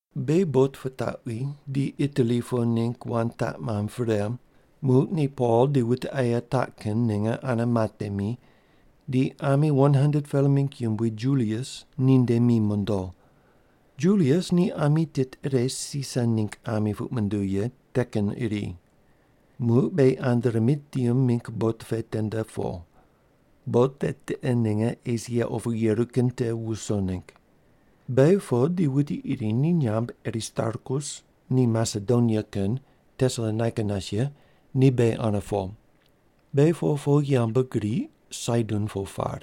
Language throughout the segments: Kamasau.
Beghi bot pitaqwi di Itali po ningg wand taq mamb pre, muq ni Pol di wute aye taq kin ninge ane matemi, di ami 100-pela mingg yumbui Julius ninde mi mondo. Julius ni ami tit ire Sisar ningg ami puq munduw ye te kin iri. Muq beghi Adramitium mingg bot pe tende po. Bot te tiqe ninge Esia opu yeru kin te wuso ningg. Beghi po di wuti iri ni nyamb Aristarkus, ni Masedonia kin, Tesalonaika nas ye, ni beghi ane po. Beghi po po yambgriq Saidon po par.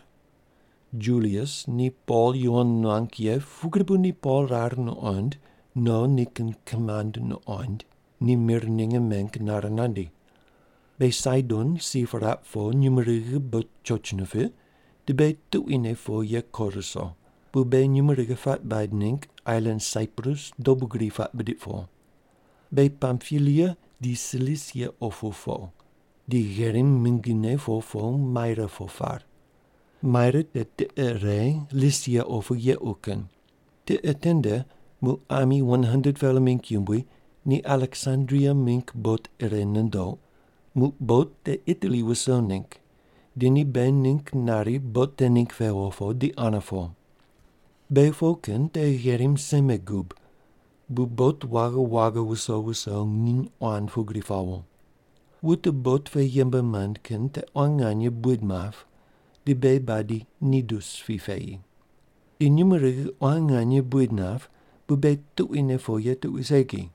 Julius ni Pol yuwon nuang ye pugri bu ni Pol rar nuqoind no nikin kimand nuqond, ni mir ninge meng nare nandi. Beghi Saidon si piraq po nyumurighi bot choch nipiq, di beghi tuquine po ye ko ruso, bu beghi nyumurighi puaq baid ningg ailan Saiprus dobu gri puaq bidiq po. Beghi Pampilia di Silisia opu po, di gherim mingine po po Maira po par. Maira te tiqe ire Lisia opu yequ kin. Tiqe tende muq ami 100-pela mingg yumbui ni Aleksandria mingg bot ire nundoq, muq bot te Itali wuso ningg di ni beghi ningg nari bot te ningg pewo po di ane po. Beghi po kin te gherim seme gub bu bot waghi waghi wuso wuso nginy quan pugri pawo. Wute bot pe yembe mand kin te quan nganye buid map, di beghi badi Nidus pi peyi. Di nyumurighi quan nganye buid nap, bu beghi tuquine po ye tuqui segi.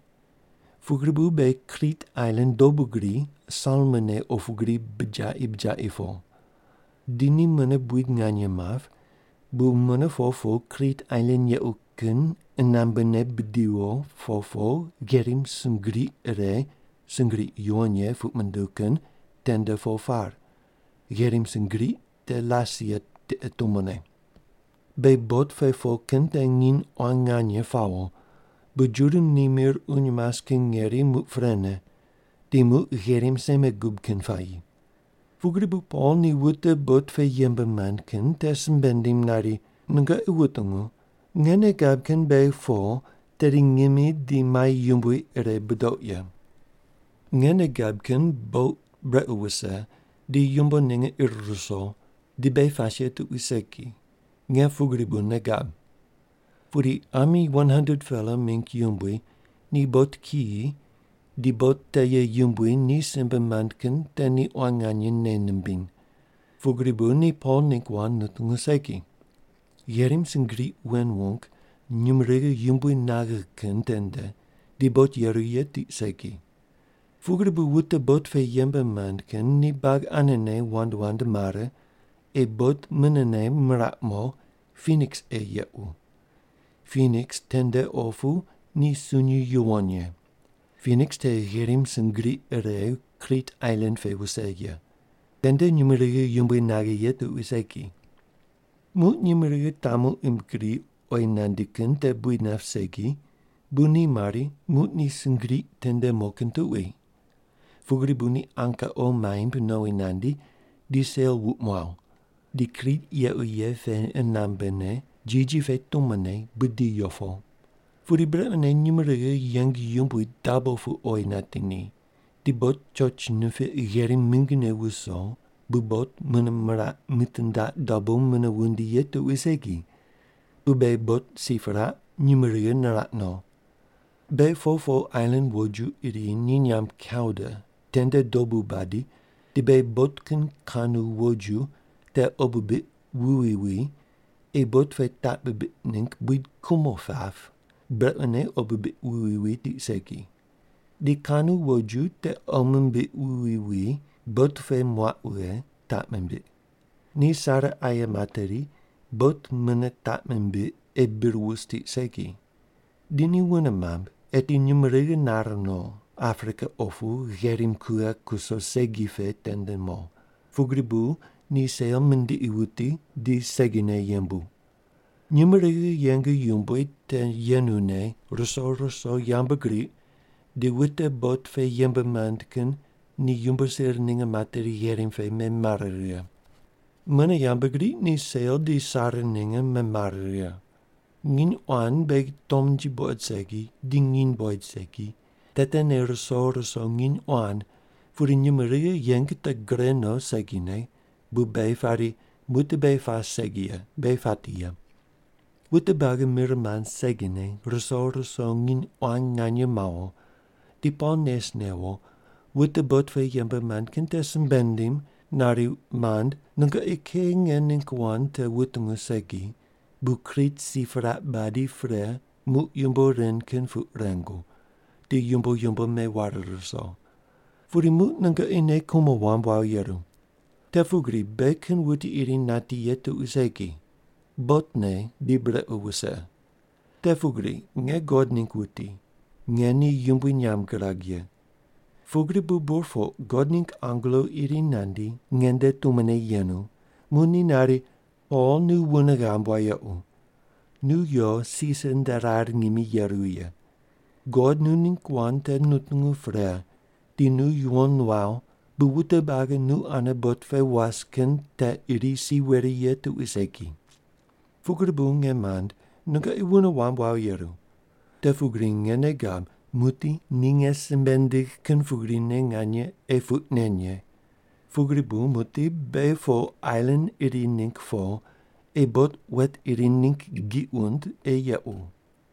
Pugri bu beghi Krit ailan dobu gri Salmone opu gri bijaqi bijaqi po. Di ni mune buid nganye map, bu mune po po Krit ailan yequ kin qunambe ne bidiwo po po, gherim sungriq ire “Sungriq Yuwon Ye” puq munduw kin tende po par. Gherim sungriq te Lasea tiqe tumone. Beghi bot pe po kin te nginy quan nganye pawo, bu Juda ni mir uny mas kin ngeri muq prene, di muq gherim seme gub kin puayi. Pugri bu Pol ni wute bot pe yembe mand kin te simbe nindim nari, “Nungoqi wutungu, nge nei gab kin beghi po tedi ngimi di mai yumbui ire budoq ye. Nge nei gab kin bot brequ wuse, di yumbo ninge ir ruso, di beghi pas ye tuqui segi. Nge pugri bu nei gab.” Pudi ami 100-pela mingg yumbui ni bot kiyi di bot te ye yumbui ni simbe mand kin te ni quan nganye nei nimbiny. Pugri bu ni Pol ningg wand nutungu segi. Gherim sungriq wen wung nyumurighi yumbui naghe kin tende di bot yeru ye tiq segi. Pugri bu wute bot pe yembe mand kin ni buagi anene wand wand mare, ei bot munene miraq mo, Piniks ei yequ. Piniks tende opu ni sunyi yuwon ye. Piniks te gherim sungriq ire Krit ailan pe wuse ye. Tende nyumurighi yumbui naghe ye tuqui segi. Muq nyumurighi tamu im gri oyi nandi kin te buid nap segi, bu ni mari, muq ni sungriq tende mo kin tuqui. Pugri bu ni anka qo maimb nowi nandi, di sel wuq muaw. Di Krit yequ ye pe qunambe ne jiji pe tumone budiyo po. Pudi brequne nyumurighi yeng yumbui dabo pu oyi nati ni, di bot choch nipiq gherim mingine wuso bu bot mune miraq mitindaq dabo mune wundi ye tuqui segi, bu beghi bot si piraq, nyumurighi niraq no. Beghi po po ailan woju iri ni nyamb Kauda tende dobu badi di beghi bot kin kanu woju te qo bibiq wuwi wi ei bot pe taq bibiq ningg buid kumo pap brequne qo bibiq wuwi wi tiq segi. Di kanu woju te qo mimbiq wuwi wi bot pe muaq wughe, taq mimbiq. Ni sare aye materi, bot mune taq mimbiq ei bir wus tiq segi. Di ni wune mamb, eti nyumurighi nare no, Aprika opu gherim kughe kuso segi pe tende mo, pugri bu ni sel mindiqi wuti di segine yembu. Nyumurighi yeng yumbui te yenune ruso ruso yambgriq di wute bot pe yembe mand kin ni yumbo sir ninge materi gherim pe memare righe. Mune yambgriq ni sel di sare ninge memare righe. Nginy quan beghi tomnji buqod segi di nginy buqoid segi, te tene ruso ruso nginy quan pudi nyumurighi yeng te gure no segine bu beghi pari, “Muqdi beghi pas segi ye, beghi pati ye.” Wute buagi mir mand segine ruso ruso nginy quan nganye mawo, di Pol nes newo, wute bot pe yembe mand kin te simbe nindim nari, “Mand nungoqi kei nge ningg wand te wutungu segi, bu Krit si piraq badi pre muq yumbo ren kin puq rengu, di yumbo yumbo meware ruso. Pudi muq nungoqi nei kumo wamb wawo yeru. Te pugri beghi kin wuti iri nati ye tuqui segi. Botne di brequ wuse. Te pugri nge God ningg wuti, nge ni yumbui nyamb girag ye. Pugri bu burpoq God ningg angelo iri nandi, nge nde tumone yenu, muq ni nari, ‘Pol nu wune ghamb wayequ. Nu yo Sisar nde rar ngimi yeru ye. God nu ningg wand te nutungu pre di nu yuwon nuaw bu wute buagi nu ane bot pe was kin te iri si weri ye tuqui segi.’ Pugri bu nge mand, nungoqi wune wamb wawo yeru. Te pugri nge nei gab muqdi ni nge simbe nindigh kin pugrine nganye ei puq nen ye. Pugri bu muqdi beghi po ailan iri ningg po ei bot wet iri ningg giq wund ei yequ.”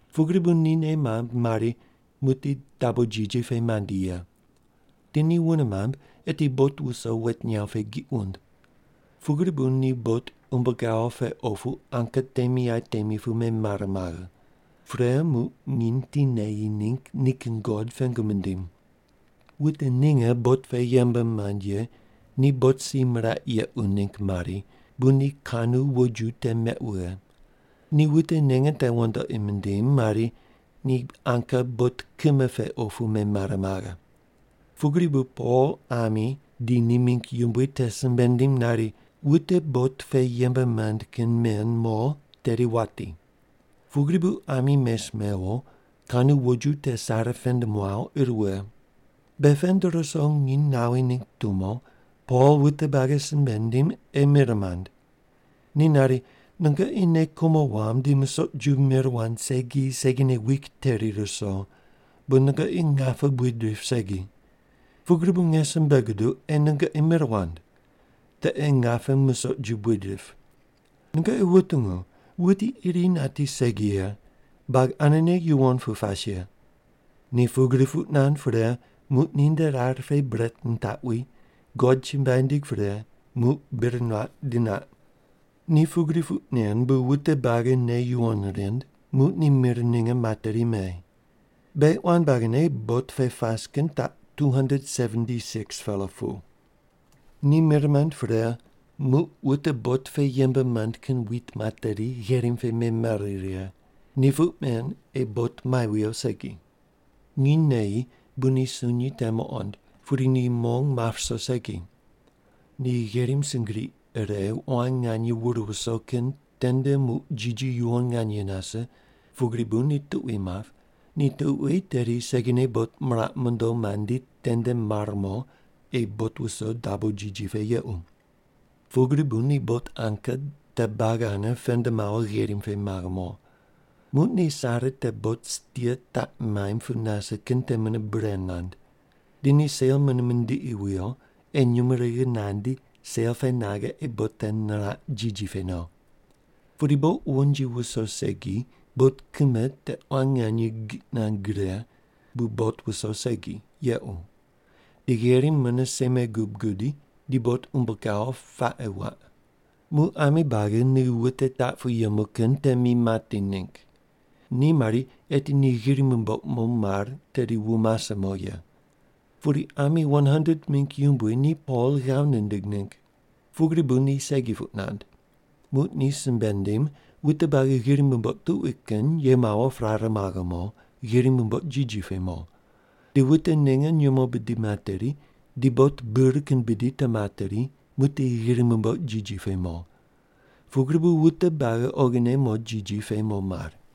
Pugri bu ni nei mamb mari, muqdi dabo jiji pe mandi ye. Di ni wune mamb, eti bot wuso wet nyaw pe giq wund. Pugri bu ni bot umbo gawo pe opu anka temi aye temi pu memare maghe. Pre muq nginy ti neyi ningg nikin god pengu mindim. Wute ninge bot pe yembe mand ye ni bot si miraq yequ ningg mari, bu ni kanu woju te meq wughe. Ni wute ninge te wandoqi mindim mari, ni anka bot kime pe opu memare maghe. Pugri bu Pol ami di ni mingg yumbui te simbe nindim nari, “Wute bot pe yembe mand kin men mo tedi wati.” Pugri bu ami mes mewo, kanu woju te sare pend muaw, ir wughe. Be pend ruso nginy nawi ningg tumo, Pol wute buagi simbe nindim ei mir mand. Ni nari, “Nungoqi nei kumo wamb di musoq ju mir wand segi segine wik teri ruso bu nungoqi ngape buid rip segi. Pugri bu nge simbe guduq, ei nungoqi mir wand. Te ei ngape musoq ju buid rip. Nungoqi wutungu, wuti iri nati segi ye. Buagi anene yuwon pu pas ye.” Ni pugri puq nand pre, muq ninde rar pe bret nitaqwi, God chumbuai nindig pre, muq bir nuaq di naq. Ni pugri puq nen bu wute buagi nei yuwon rind, muq ni mir ninge materi me. Beghi quan buagine bot pe pas kin taq 276-pela pu. Ni mir mand pre, muq wute bot pe yembe mand kin wit materi, gherim pe memare righe. Ni puq men ei bot mai wuyo segi. Nginy neyi bu ni sunyi te muqond, pudi ni mong map ruso segi. Ni gherim sungriq ire quan nganye wur wuso kin tende muq jiji yuwon nganye nase, pugri bu ni tuqui map, ni tuqui tedi segine bot miraq mondo mandi tende mar mo, ei bot wuso dabo jiji pe yequ. Pugri bu ni bot anka te buagi ane pend mawo gherim pe maghe mo. Muq ni sare te bot stia taq maimb pu nase kin te mune bure mand. Di ni sel mune mindiqi wuyo, ei nyumurighi nandi sel pe naghe ei bot te niraq jiji pe no. Pudi bot wonji wuso segi bot kime te quan nganye giq nand gre, bu bot wuso segi, yequ. Di gherim mune seme gub gudi, di bot umbo gawo paqe wuaq. Muq ami buagi ni wute taq pu yemu kin te mi mati ningg. Ni mari, eti ni ghiri mumboq mo mar, tedi wu mase mo ye. Pudi ami 100-pela mingg yumbui ni Pol ghav nindig ningg. Pugri bu ni segi puq nand. Muq ni simbe nindim wute buagi ghiri mumboq tuqui kin ye mawo prare maghe mo, ghiri mumboq jiji pe mo. Di wute ninge nyumo bidi materi, di bot bir kin bidi te materi muqdi ghiri mumboq jiji pe mo. Pugri bu wute buagi oghine mo jiji pe mo mar.